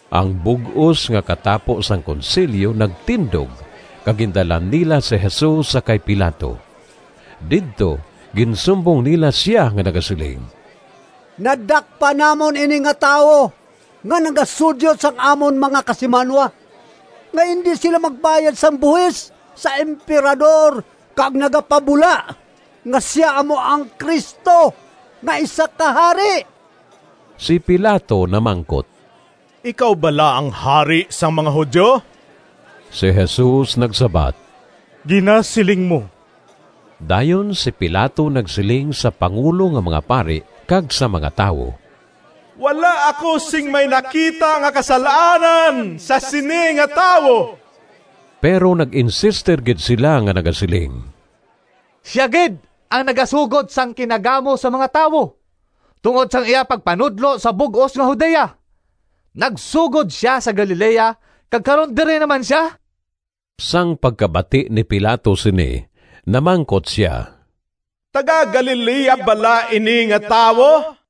Ang bug-os nga katapo sang Konsilyo nagtindog kag gindala nila si Jesus sa kay Pilato. Didto ginsumbong nila sia nga nagasiling, “Nadakpan namon ini nga tawo nga nagasudyot sang amon mga kasimanwa nga indi sila magbayad sang buhis sa Emperador kag nagapabula nga sia amo ang Cristo nga isa ka hari.” Si Pilato namangkot, “Ikaw bala ang hari sang mga Judio?” Si Jesus nagsabat, “Ginasiling mo.” Dayon si Pilato nagsiling sa pangulo nga mga pari kag sa mga tawo, “Wala ako sing may nakita nga kasal-anan sa sini nga tawo.” Pero nag-insister gid sila nga nagasiling, “Sia gid ang nagasugod sang kinagamo sa mga tawo tungod sang iya pagpanudlo sa bug-os nga Judea! Nagsugod sia sa Galilea, kag karon diri na man sia.” Sang pagkabati ni Pilato sini namangkot sia, “Taga-Galilea bala ini nga tawo?”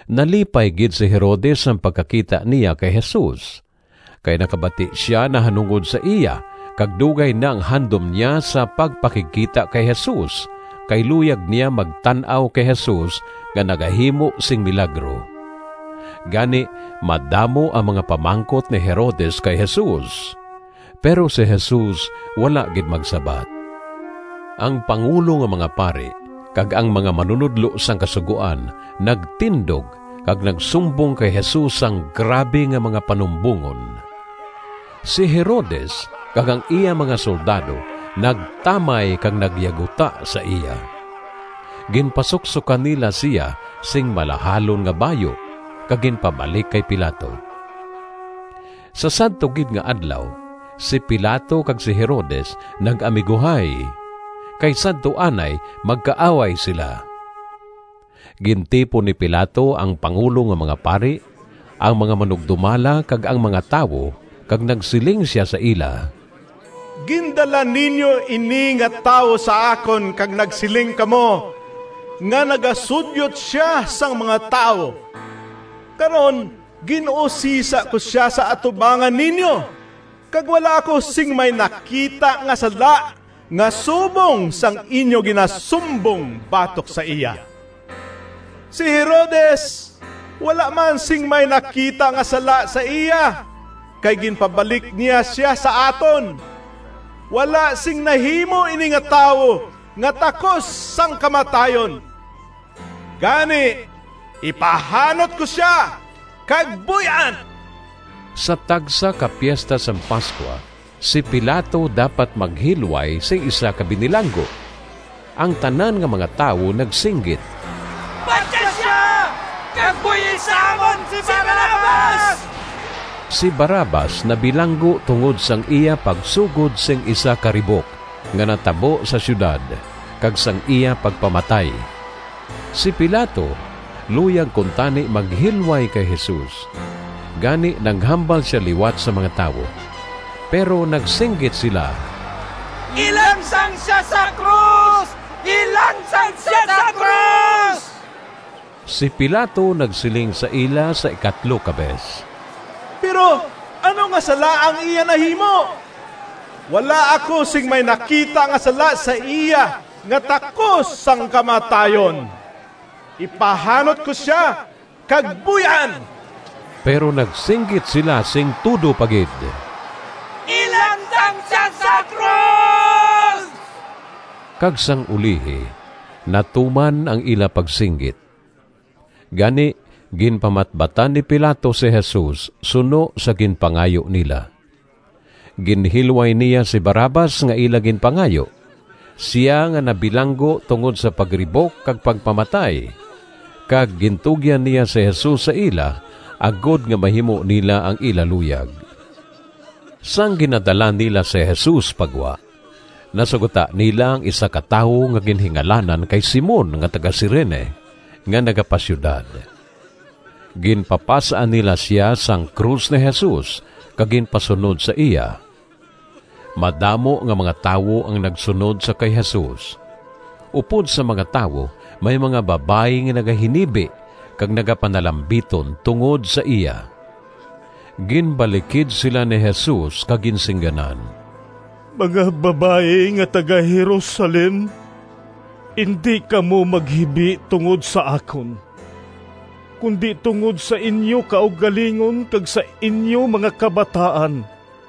Nalipay gid si Herodes sang pagkakita niya kay Jesus, kay nakabati sia nahanungod sa iya kag dugay na ang handom niya sa pagpakigkita kay Jesus kay luyag niya magtan-aw kay Jesus nga nagahimo sing milagro. Gani madamo ang mga pamangkot ni Herodes kay Jesus, pero si Jesus wala gid magsabat. Ang pangulo nga mga pari kag ang mga manunodlo sang Kasugoan nagtindog kag nagsumbong kay Jesus sang grabe nga mga panumbongon. Si Herodes kag ang iya mga soldado nagtamay kag nagyaguta sa iya. Ginpasuksokan nila sia sing malahalon nga bayu kag ginpabalik kay Pilato. Sa sadto gid nga adlaw si Pilato kag si Herodes nag-amiguhay, kay sadto anay magkaaway sila. Gintipon ni Pilato ang pangulo nga mga pari, ang mga manugdumala kag ang mga tawo, kag nagsiling sia sa ila, “Gindala ninyo ini nga tawo sa akon kag nagsiling kamo nga nagasudyot sia sang mga tawo. Karon, gin-usisa ko sia sa atubangan ninyo kag wala ako sing may nakita nga sala nga subong sang inyo ginasumbong batok sa iya. Si Herodes wala man sing may nakita nga sala sa iya, kay ginpabalik niya sia sa aton. Wala sing nahimo ini nga tawo nga takos sang kamatayon. Gani, ipahanot ko sia, kag buy-an.” [ Sa tagsa ka Piesta sang Pascua si Pilato dapat maghilway sing isa ka binilanggo.] Ang tanan nga mga tawo nagsinggit, “Patya sia kag buy-i sa amon si Barrabas.” (Si Barrabas nabilanggo tungod sang iya pagsugod sing isa ka ribok nga natabo sa siyudad, kag sang iya pagpamatay.) Si Pilato luyag kuntani maghilway kay Jesus, gani naghambal sia liwat sa mga tawo. Pero nagsinggit sila, “Ilansang sia sa krus! Ilansang sia sa krus!” Si Pilato nagsiling sa ila sa ikatlo ka bes, “Pero ano nga sala ang iya nahimo? Wala ako sing may nakita nga sala sa iya nga takos sang kamatayon. Ipahanot ko sia kag buy-an.” Pero nagsinggit sila sing tudo pa gid, “Ilansang sia sa krus!” Kag sang ulihi natuman ang ila pagsinggit. Gani ginpamatbatan ni Pilato si Jesus suno sa ginpangayo nila. Ginhilway niya si Barrabas nga ila ginpangayo, sia nga nabilanggo tungod sa pagribok kag pagpamatay, kag gintugyan niya si Jesus sa ila agod nga mahimo nila ang ila luyag. Sang ginadala nila si Jesus pa gwa, nasugata nila ang isa ka tawo nga ginhingalanan kay Simon nga taga-Cirene nga nagapa-siyudad. Ginpapas-an nila sia sang krus ni Jesus kag ginpasunod sa iya. Madamo nga mga tawo ang nagsunod sa kay Jesus. Upod sa mga tawo may mga babayi nga nagahinibi kag nagapanalambiton tungod sa iya. Ginbalikid sila ni Jesus kag ginsingganan, “Mga babayi nga taga-Jerusalem, indi kamo maghibi tungod sa akon, kundi tungod sa inyo kaugalingon kag sa inyo mga kabataan.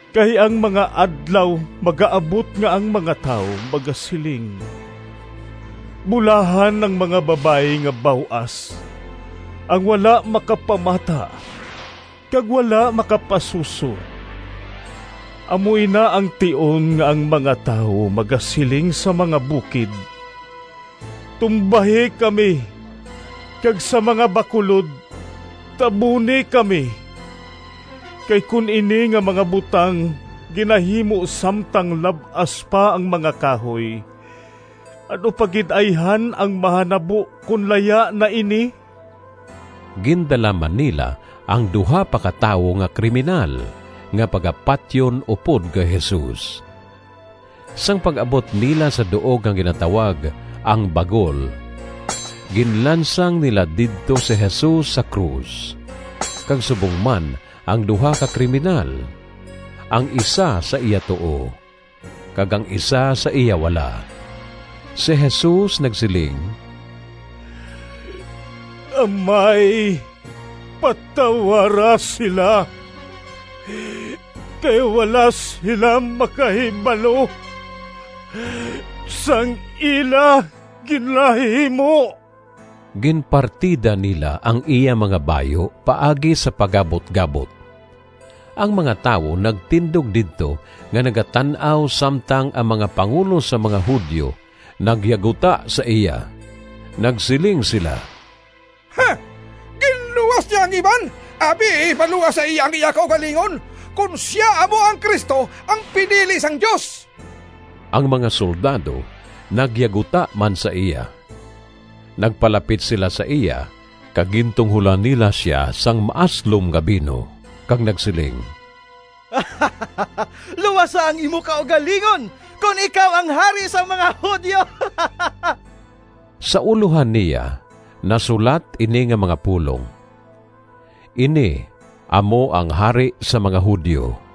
Kay ang mga adlaw magaabot nga ang mga tawo magasiling, ‘Bulahan ang mga babayi nga baw-as, ang wala makapamata, kag wala makapasuso!’ Amo ina ang tion nga ang mga tawo magasiling sa mga bukid, ‘Tumbahi kami!’ kag sa mga bakulod, ‘Tabuni kami!’ Kay kon ini nga mga butang ginahimo samtang lab-as pa ang mga kahoy, ano pa gid ayhan ang mahanabo kon laya na ini?” Gindala man nila ang duha pa ka tawo nga kriminal, nga pagapatyon upod kay Jesus. Sang pag-abot nila sa duog nga ginatawag “Ang Bagol,” ginlansang nila didto si Jesus sa krus, kag subong man ang duha ka kriminal, ang isa sa iya tuo kag ang isa sa iya wala. Si Jesus nagsiling, “Amay, patawara sila, kay wala sila makahibalo sang ila ginahimo.” Ginpartida nila ang iya mga bayu paagi sa pagabut-gabot. Ang mga tawo nagtindog didto nga nagatan-aw samtang ang mga pangulo sang mga Judio nagyaguta sa iya. Nagsiling sila, “Ginluwas niya ang iban, abi ipaluwas sa iya ang iya kaugalingon, kon sia amo ang Cristo, ang pinili sang Dios.” Ang mga soldado nagyaguta man sa iya. Nagpalapit sila sa iya kag gintungholan nila sia sang maaslom nga bino kag nagsiling, “Luwasa ang imo kaugalingon, kon ikaw ang hari sang mga Judio!” Sa ulohan niya nasulat ini nga mga pulong, “Ini amo ang Hari sang mga Judio.”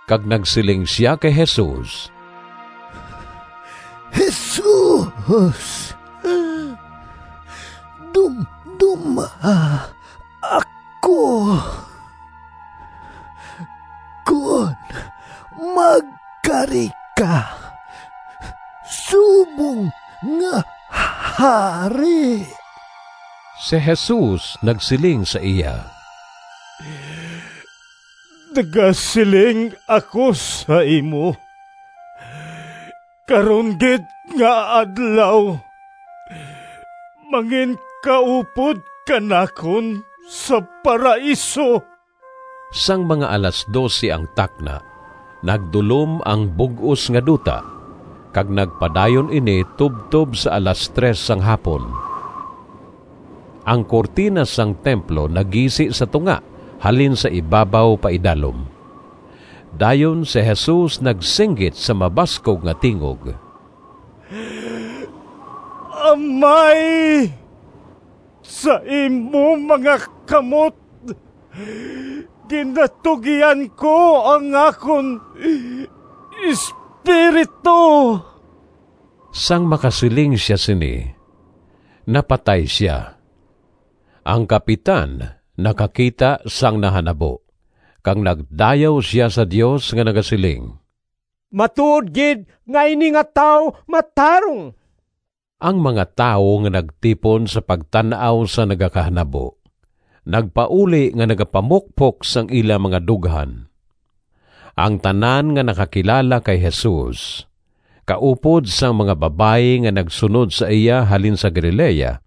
Kag nagsiling sia kay Jesus, “Jesus, dumdoma ako kon magkari ka subong nga hari.” Si Jesus nagsiling sa iya, “Nagasiling ako sa imo, karon gid nga adlaw manginkaupod ka nakon sa Paraiso.” Sang mga alas dose ang takna nagdulom ang bug-os nga duta kag nagpadayon ini tubtob sa alas tres sang hapon. Ang kurtina sang templo nagisi sa tunga halin sa ibabaw paidalom. Dayon si Jesus nagsinggit sa mabaskog nga tingog, “Amay, sa imo mga kamot ginatugyan ko ang akon espiritu.” Sang makasiling sia sini napatay sia. Ang kapitan nakakita sang nahanabo, kag nagdayaw sia sa Dios nga nagasiling, “Matuod gid nga ini nga tawo matarong.” Ang mga tawo nga nagtipon sa pagtan-aw sang nagakahanabo, nagpauli nga nagapamukpok sang ila mga dughan. Ang tanan nga nakakilala kay Jesus, kaupod sang mga babayi nga nagsunod sa iya halin sa Galilea,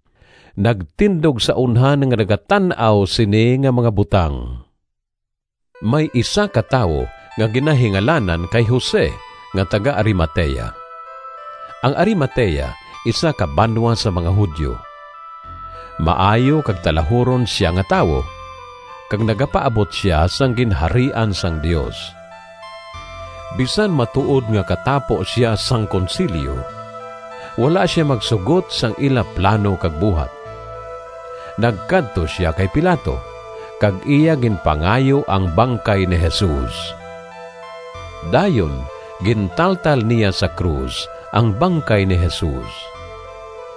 nagtindog sa unhan nga nagatan-aw sini nga mga butang. May isa ka tawo nga ginahingalanan kay Jose nga taga-Arimatea. Ang Arimatea isa ka banwa sang mga Judio. Maayo kag talahuron sia nga tawo, kag nagapaabot sia sang Ginharian sang Dios. Bisan matuod nga katapo sia sang Konsilyo, wala sia magsugot sang ila plano kag buhat. Nagkadto sia kay Pilato kag iya ginpangayo ang bangkay ni Jesus. Dayon gintaltal niya sa krus ang bangkay ni Jesus,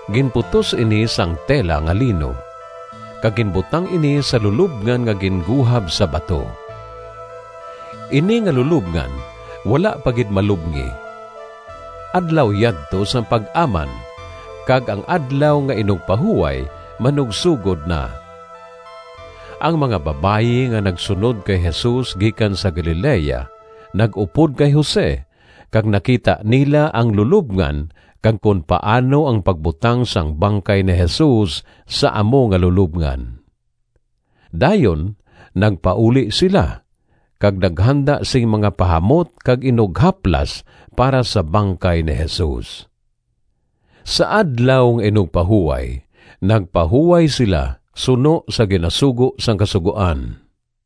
ginputos ini sang tela nga lino, kag ginbutang ini sa lulobngan nga ginguhab sa bato. Ini nga lulobngan wala pa gid malubngi. Adlaw yadto sang Pag-aman kag ang Adlaw nga Inugpahuway manugsogod na. Ang mga babayi nga nagsunod kay Jesus gikan sa Galilea nag-upod kay Jose kag nakita nila ang lulobngan kag kon paano ang pagbutang sang bangkay ni Jesus sa amo nga lulobngan. Dayon nagpauli sila kag naghanda sing mga pahamot kag inughaplas para sa bangkay ni Jesus. Sa Adlaw nga Inugpahuway nagpahuway sila suno sa ginasugo sang Kasugoan.